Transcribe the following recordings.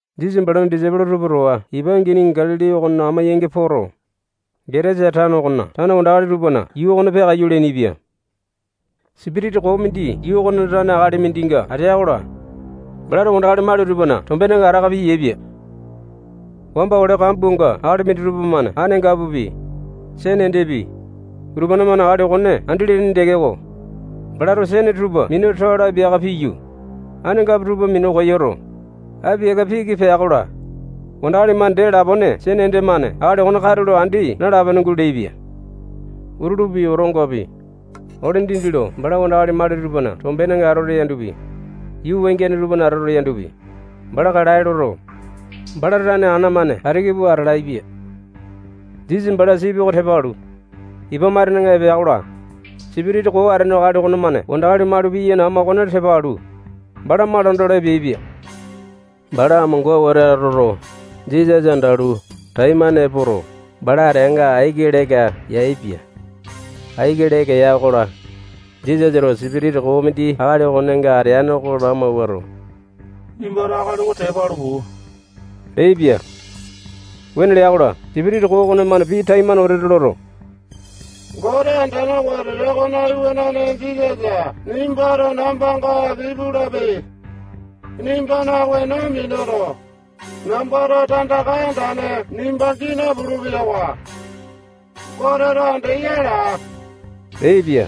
Jisasa balana disaipolo tupa towa ipa angini Galili okona amo-yangi poto, Getasa tano okona tane wandakali tupana yuu okona peakaiyu leainipia. Sipitisa koo mindi yuu okonena tane akali mindinga ateya-kola, balato wandakali mali tupana tombenga ataka piyaepia. Wamba ole kambuanga akali minditupa-mane anangapupi, sene endepi, utupane-mane akali okone andi leaini tekeko, balato sene tupa minu toae lo apiaka piyu, anangapu tupa minu koyoto, apiaka piki piya ya-kola, wandakali-mane dee lapone sene ende-mane akali okone katulo andi nalape-pene guleaipia. Utulupi, otongapi, ole dindi lo bala wandakali mali tupana tombenga atoto yandopi, yuu wangiane tupana atoto yandopi, bala kalae loto, bala tane ana-mane katiki pua atalaepia. Jisasa bala sipi oko tepa alu, ipa matenenga epea-kola, sipitisa koo atene akali okonemane wandakali mali piyaini ama okone tepa alu, bala malanda olo epeaipia. Bala amonga wete atoto, Jisasa andalu, taimane epoto, bala ateanga aiki leka yaepia. Aiki leka ya-kola, Jisasato sipitisa koo mindi akali okonenga atene oko lamawuato, nimbato akali oko tepa alu, puu leaipia. Wuane lea-kola, sipitisa koo okonemane pii taimane wete loto, Gote andane wetete okona Iwanane Jisasa nimbato nambanga aki pulape. Nimbana weno minuto, nambato tandaka andane nimba gii napulu-peyawa. Goteto andeya laa leaipia.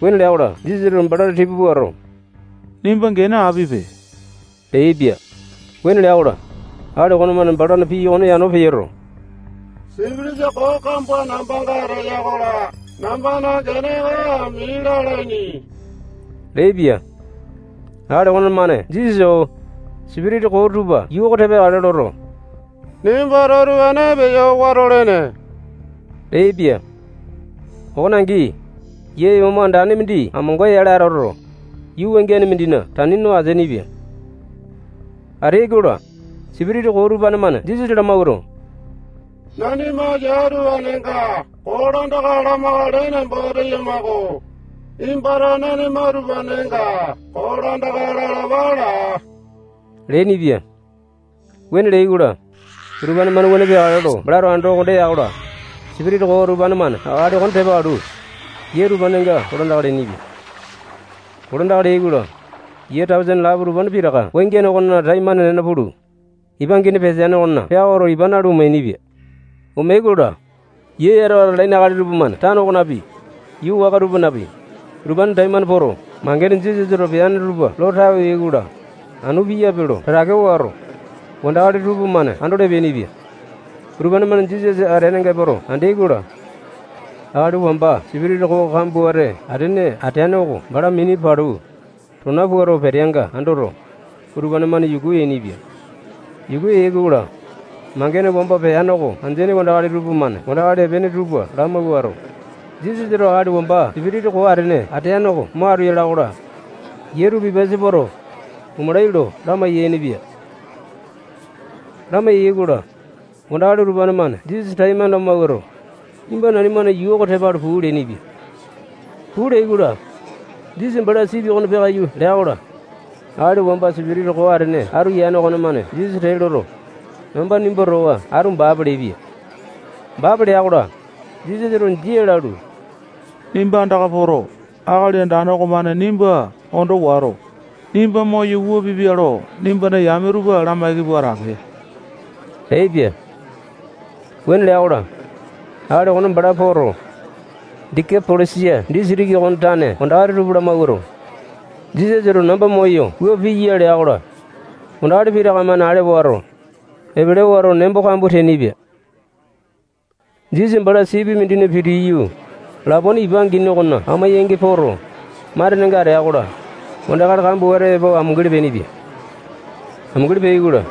Wuane lea-kola, Jisasato bala tipa puato, nimba gene apipe leaipia. Wuane lea-kola, akali okonemane balana pii okone yano peyoto, sipitisa koo kambua nambanga ateya-kola, nambana gene oko ami lalaini leaipia. Akali okonemane Jisasa-o-o, sipitisa koo tupa yuu oko tepa yakale loto, nimbato utupane peyo watolene leaipia. Okone angi, yia yomo andane mindi amonga-yale atoto, yuu wangiane mindina tani no ateainipia. Ateai-kola, sipitisa koo utupane-mane Jisasa lamawuato, nanima yia utupanenga kolandaka lamakale nembo teyama-ko. Nimbato nanima utupanenga kolandaka lalapa laa leainipia. Wuane leai-kola, utupane-mane wuane peakale lo balato ando konda ya-kola, sipitisa koo utupane-mane akali okone tepa alu, yia utupanenga kolandaka leainipia. Kolandaka leai-kola, yia tausene lapo utupane pitaka wangiane okona taimane nena pulu, ipa angini peteane okona peakoto, ipa nalu, omeainipia. Omeai-kola, yia yatawa atalaini akali tupamane tano okonapi, yuu waka tupanapi, utupanena taimane poto, mangene Jisasato peane tupa lo tawe yai-kola, anu piyape lo tatake wato, wandakali tupamane andolo epeainipia. Utupane-mane Jisasa ateanga epoto andeai-kola, akali wamba sipitisa koo kambua wete atene ateane oko bala mini palu, tona puato, peteanga andoto, utupane-mane yuku yainipia. Yuku yai-kola, mangene wamba peane oko andeaini wandakali tupamane wandakali epeaini tupa lamawuato, Jisasato akali wamba sipitisa koo atene ateane oko mo atu yala-kola, yia tupa ipasa poto, omalai lo lamai-yainipia. lamaiya-kola, wandakali utupane-mane Jisasa taimane lamawuato, nimba nanimana yuu oko tepa alu puu leainipia. Puu leai-kola, Jisasa bala sipi okona peakaiyu lea-kola, akali wamba sipitisa koo atene atu yane okomane Jisasa tee loto, namba nimba towa atu baape leaipia. Baape lea-kola, Jisasato jia lalu, nimba andaka poto, Akali Andane okomane nimba ondo wato, nimba moyo wua piya lo nimbana yame tupa lamaiki pua atape leaipia. Wuane lea-kola, akali okone bala poto, Dekapolisa disitiki okona tane wandakali tupa lamawuato, Jisasato namba moyo wua piya lea-kola, wandakali pitaka-mane ale wato, epele wato, nembo kambua teainipia. Jisasa bala sipi mindina pitiyu, lapone ipa angini okona amo-yangi poto, matenenga atea-kola, wandakali kambua wete epo amunguli peainipia. Amunguli peai-kola,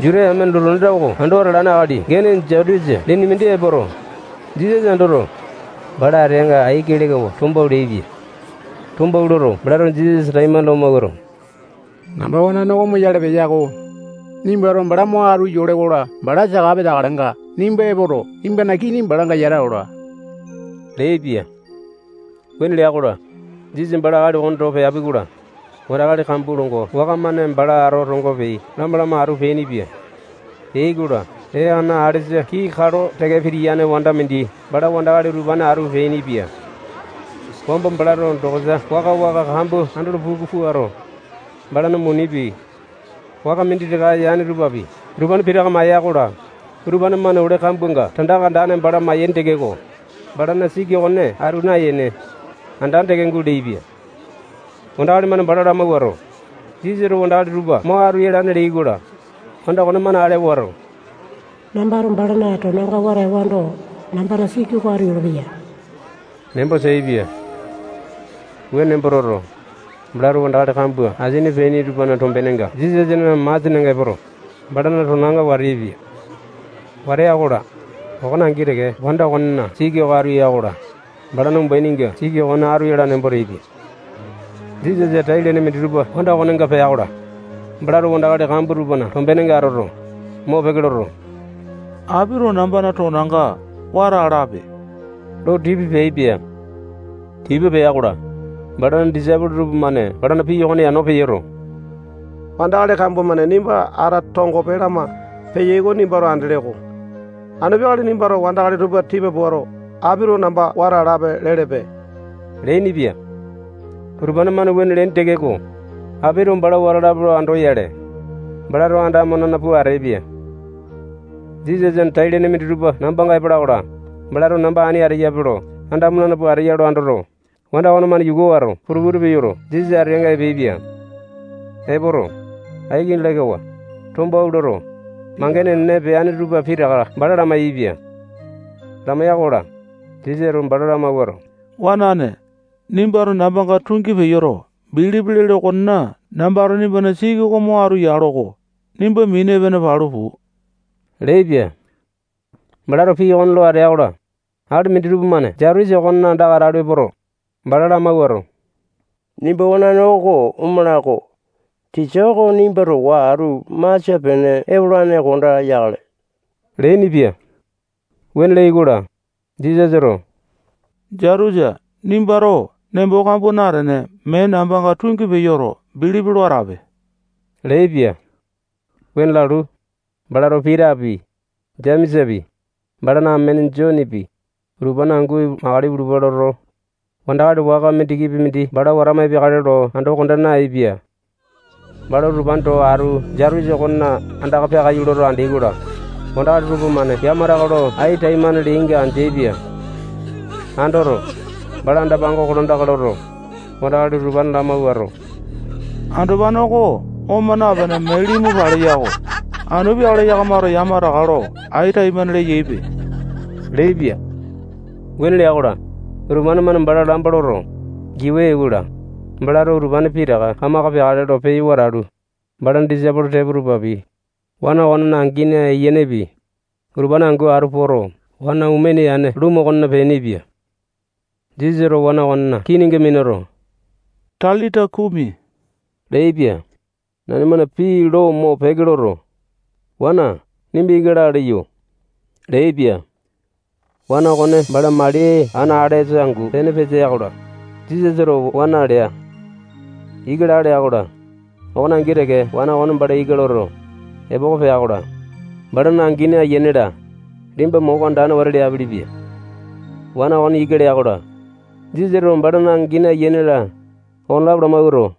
Juta yamena lotu anda oko ando atalane akali gene Jaitusa lene mindi epoto, Jisasa andoto, bala ateanga aiki lekawa tombawua leaipia. Tombawua loto, balato Jisasa taimane lamawuato, namba wanane oko omoyale peya-ko. Nimbato bala mo atu yole-kola, bala saka peteakalenga, nimba epoto, nimbana kini balanga yata ola leaipia. Wuane lea-kola, Jisasa bala akali okone towa peapi-kola, wandakali kambua longo waka-mane bala ata tongope lama-lama atu peainipia. Peai-kola, ee ana alesa kii kalo teke pitiyane wanda mindi bala wandakali utupane atu peainipia. Wamba balato dokosa waka-waka kambua andolo puku puato, balana munipi, waka minditaka yane tupapi, utupane pitaka maya-kola, utupane-mane ole kambuanga tandaka andane bala mayaini tekeko, balana siki okone atu nayene, andane teke guleaipia. Wandakali-mane bala lamawuato, Jisasato wandakali tupa mo atu yalane leai-kola, wanda okonemane ale wato, nambato balana tonanga wata ewando, nambana siki oko atu yolopeya nembo teaipia. Wuane nembo toto, balato wandakali kambua asini peaini tupana tombenenga Jisasana masianenga epoto, balana tonanga wata yaepia. Wata ya-kola, okone angi teke wanda okonena siki oko atu ya-kola, balana umbaininga siki okone atu yala nembo teaipia. Jisasana tai-lene minditupa wanda okonenga pea-kola, balato wandakali kambua tupana tombenenga atoto, mopeke loto, apito nambana tonanga wata alape lo tipa peaipia. Tipa pea-kola, balana disaipolo tupamane balana pii okone yano peyoto, wandakali kambua-mane nimba ata tongope lama peyai oko nimbato andele-ko. Anu peakale nimbato wandakali tupa tipa puato, apito namba wata alape lelepe leainipia. Utupane-mane wuane leaini tekeko, apito bala wata alape lo andoyale, balato andamo nena pua ateaipia. Jisasana tai-lene minditupa nambanga epala-kola, balato namba ani ateyape lo andamo nena pua ateya lo andoto, wanda okonemane yuku wato, putu-putu peyoto, Jisasa ateanga epeaipia. Epoto, aiki lekawa, tombawua loto, mangene enene peane tupa pitaka bala lamai-yaepia. lamaiya-kola, Jisasato bala lamawuato, wanane, nimbato nambanga tungi peyoto, bilipi lele okonena, nambato nimbana siki oko mo atu yalo-ko. Nimba mini epene palu puu leaipia. Balato pii okone lo atea-kola, akali minditupa-mane Jaitusa okona andaka atala epoto, bala lamawuato, nimba wanane oko omala-ko. Tisa oko nimba towa atu masia-pene epolane konda yakale leainipia. Wuane leai-kola, Jisasato Jaitusa nimbato nembo kambua natene, mee nambanga tungi peyoto, bilipi lo atape leaipia. Wuane lalu, balato Pitapi, Jemesapi, balana amene Jonepi, utupane angu makale ipulupa loto, wandakali waka mindikipi mindi bala watama epeakale lo ando konda nayaepia. Bala utupane towa atu Jaitusa okona andaka peakaiyu loto andeai-kola, wandakali tupamane yamataka lo ai taimane leainga andeaipia. Andoto, bala anda-pango kolandaka loto, wandakali utupane lamawuato, andopane oko oma napene, mee limu paleya-ko. Anu peakale yakamato yamataka lo ai taimane leyaipe leaipia. Wuane lea-kola, utupane-mane bala lamba loto, giwa yai-kola, balato utupane pitaka kamaka peakale lo peyo watalu, balana disaipolo tepo tupapi, wana okonena angini, ayianepi, utupane angu atu poto, wana omene yane lumu okona peainipia. Jisasato wana okonena kininga minuto, talita kumi leaipia. Nanimana pii lo mopeke loto, wana nimba ika laa leyo leaipia. Wana okone bala mali ana alesa angu pene petea-kola, Jisasato wana lea. Ika laa lea-kola, okone angi teke wana okone bala ika loto, epoko pea-kola, balana angini, ayiane-la, liyamba moko andane wete leapelepia. Wana okone ika lea-kola, Jisasato balana angini, ayiane-la, okonelapo lamawuato,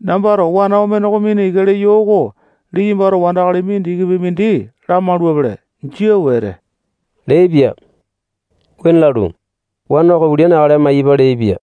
nambato wana omene oko mina ika leyo oko liyambato wandakali mindikipi mindi lamaulapele. Jia wete leaipia. Wuane lalu, wana oko ulia neakale maiyapa leaipia.